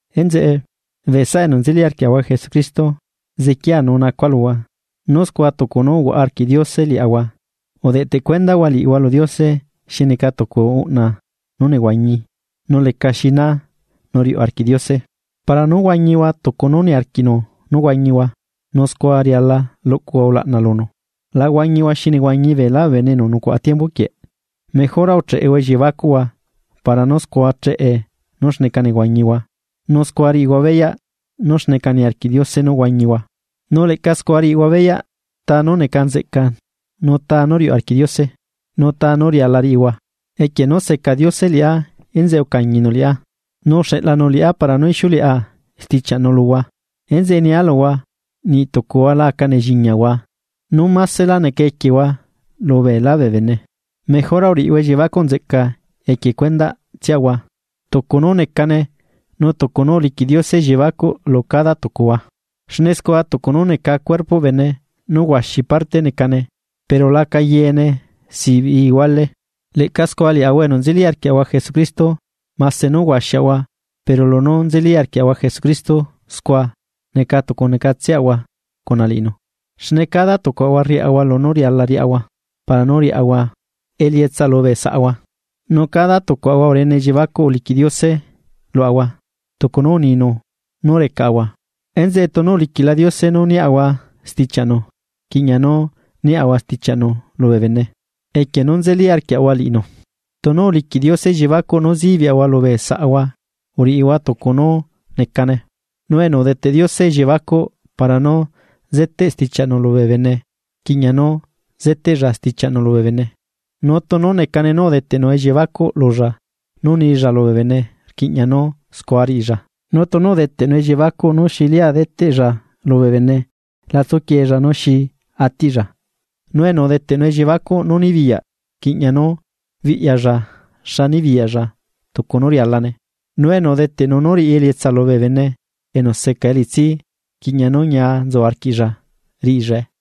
Enzeꞌe, bee saꞌa enu nzeli arquiaꞌahua Jesucristo, sequia nu nacua luhua, nú scua tucu nú uhuaꞌa arquiꞌ Diose liaꞌahua, udeꞌtecuendahua liꞌihua lu Diose xi neca tucu uꞌna nú nehuañi nú lecaxina nu riuꞌ arquiꞌ Diose. Para nú huañihua tucu nú niarquiꞌnu nú huañihua nu scua riala luꞌcuhua ulaꞌna lunu. La huañihua xi nehuañi beelá bee bene enu nucuaꞌa tiembu quieꞌ, mejora ucheꞌehua elliebacuꞌhua para nú scua cheꞌe nú xneca nehuañihua nu scua riꞌihua beyaꞌ nú xneca niarquiꞌ Diose nú huañihua. Nu leꞌca scua riꞌihua beyaꞌ ta nú neca nzeꞌca nu ta nú riuꞌ arquiꞌ Diose, nu ta nú riala riꞌihua. Equie nú seca Diose liꞌá enzeꞌe ucañinu liꞌá, nu uxeꞌlanu liꞌá para nú ixiuleꞌa stichiaꞌnu luhua. Enzeꞌe nialuhua, niꞌtucuhua la aca nelliñiahua nú másela neca equiehua lubeelá bee bene. Mejora uriꞌihua elliebacuꞌ nzeꞌca equie cuendaꞌtsiahua tucu nú necane nu tucu nú uliquiꞌ Diose elliebacuꞌ lu cada tucuhua. Xne scua tucu nú neca cuerpoꞌ bene nú huaxi parte necane pero laca yeene sibiꞌi ihuale. Leꞌca scua liaꞌahua enu nzeli arquiaꞌahua Jesucristo mase nú huaxiaꞌahua pero lunú nzeli arquiaꞌahua Jesucristo scua neca tucunecatseꞌahua cuna liꞌinu, xne cada tucuaꞌahua riaꞌahua lunú riala riaꞌahua para nú riaꞌahua elietsa lubee saꞌahua. Nu cada tucuaꞌahua urene elliebacuꞌ uliquiꞌ Diose luaꞌahua tucu nú uninu nú recaꞌahua. Enzeꞌe tunu uliquiꞌla Diose nú niaꞌahua stichiaꞌnu, rquiꞌña nú niaꞌahua stichiaꞌnu lubee bene, equie nú nzeli arquiaꞌahua liꞌinu. Tunu uliquiꞌ Diose elliebacuꞌ nú zibiꞌahua lubee saꞌahua uriꞌihua tucu nú necane. nu enu udeteꞌ Diose elliebacuꞌ para nú zeteꞌ stichiaꞌnu lubee bene rquiꞌña nú zeteꞌlla stichiaꞌnu lubee bene. Nu tunu necane nú udeteꞌnu elliebacuꞌ lulla nú nilla lubee bene rquiꞌña nú scua riꞌilla. Nu tunu udeteꞌnu elliebacuꞌ nú xi lia deteꞌlla lubee bene la tsuquiella nú xi atiꞌlla, nu enu deteꞌnu elliebacuꞌ nú nibiyaꞌ rquiꞌña nú biꞌyalla xa nibiyaꞌlla tucu nú rialane, nu enu udeteꞌnu nú riꞌi elietsa lubee bene enu seca elitsi rquiꞌña nú ñia nzu arquiꞌlla riꞌillae.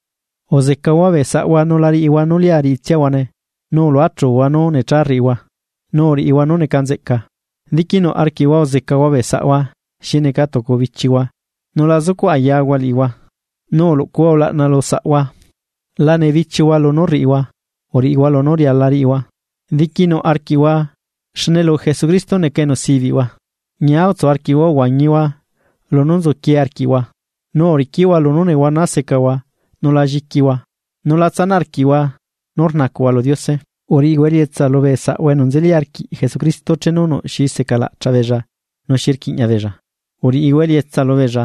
Uzecahua bee saꞌhua nu la riꞌihua nú lia riꞌitsiahuane nu uluachuhua nú necha rriꞌihua, nu uriꞌihua nú neca nzeꞌca. Diquinuꞌ arquiꞌhua uzecahua bee saꞌhua xi neca tucu bichihua nu la zucuꞌ ayahua liꞌihua, nu uluꞌcuhua ulaꞌna lusaꞌhua. La nebichiuhua lunú rriꞌihua uriꞌihua lunú riala riꞌihua, diquinuꞌ arquiꞌhua xne lu Jesucristo neca enu sibiꞌhua. Ñia utsu arquiꞌhua uhuañihua lunú nzuquie arquiꞌhua, nu uriquiꞌhua lunú nehuana secahua nu la lliquihua, nu la tsanaꞌ arquiꞌhua nú rnacuꞌhua lu Diose. Uriꞌihua elietsa lubee saꞌahua enu nzeli arquiꞌ Jesucristo chenu nuꞌ xi secalaꞌchaꞌbeella nu xi rquiꞌña beella, uriꞌihua elietsa lubeella.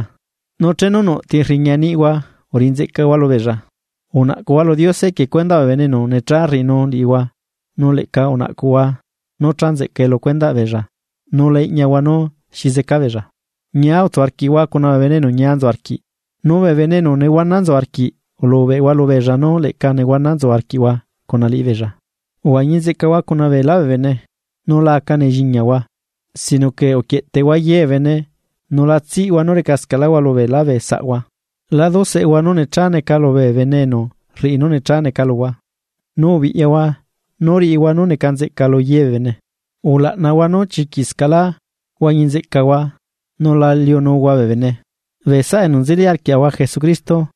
Nu chenu nuꞌ ti rriña niꞌhua uriꞌi nzeꞌcahua lubeella. Unaꞌcuꞌhua lu Diose equie cuendaꞌ bee bene enu necha rriꞌinu liꞌihua nu leꞌca unaꞌcuhua nú cha nzeꞌcae lu cuendaꞌ beella nu la iꞌñahua nú xi zeca beella. Ñia utsu arquiꞌhua cuna bee bene enu ñia nzu arquiꞌ, nu bee bene enu nehuana nzu arquiꞌ ulubeꞌhua lubeella nú leꞌca nehuana nzu arquiꞌhua cuna liꞌibeella. Uhuañi nzeꞌcahua cuna beelá bee bene, nu la aca nelliñiahua sino que uquieꞌteꞌhua ye bee bene, nu la tsiꞌhua nú recascaꞌlahua lubeelá bee saꞌhua. La duseꞌehua nú necha neca lubee bene enu rriꞌi nú necha neca luhua, nu ubiꞌyahua nú riꞌihua nú neca nzeꞌca lu ye bee bene. Ulaꞌnahua nú chiquiꞌscaꞌlá huañi nzeꞌcahua nu la liunuhua bee bene. Bee saꞌa enu nzeli arquiaꞌahua Jesucristo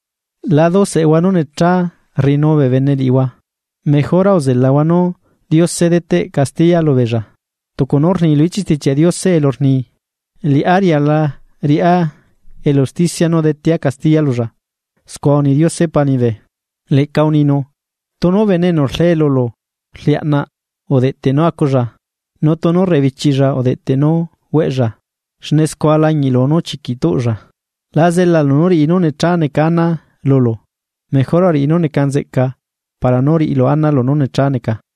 la duseꞌehua nú necha rriꞌinu bee bene liꞌihua mejora uzelahua nú Diose deteꞌ castiya lubeella, tucu nú rni lu ichiꞌ Stichiaꞌ Diose elu rni: “Liꞌá riala riꞌá elu usticia nu detea castiya lulla. Scua uni Diose Pa liñibe.” Leꞌca uninu: “Tunu bene enu rle lulu rliaꞌnaꞌ udeꞌteꞌ nú aculla, nu tunu rrebichiꞌlla udeꞌteꞌ nú hueꞌlla, xne scua lañiꞌlu nú chiquiꞌ tuꞌlla.” La zelalu nú riꞌi nú necha neca ana lulu mejora uriꞌi nú neca nzeꞌca para nú riꞌilu ana lunú necha neca.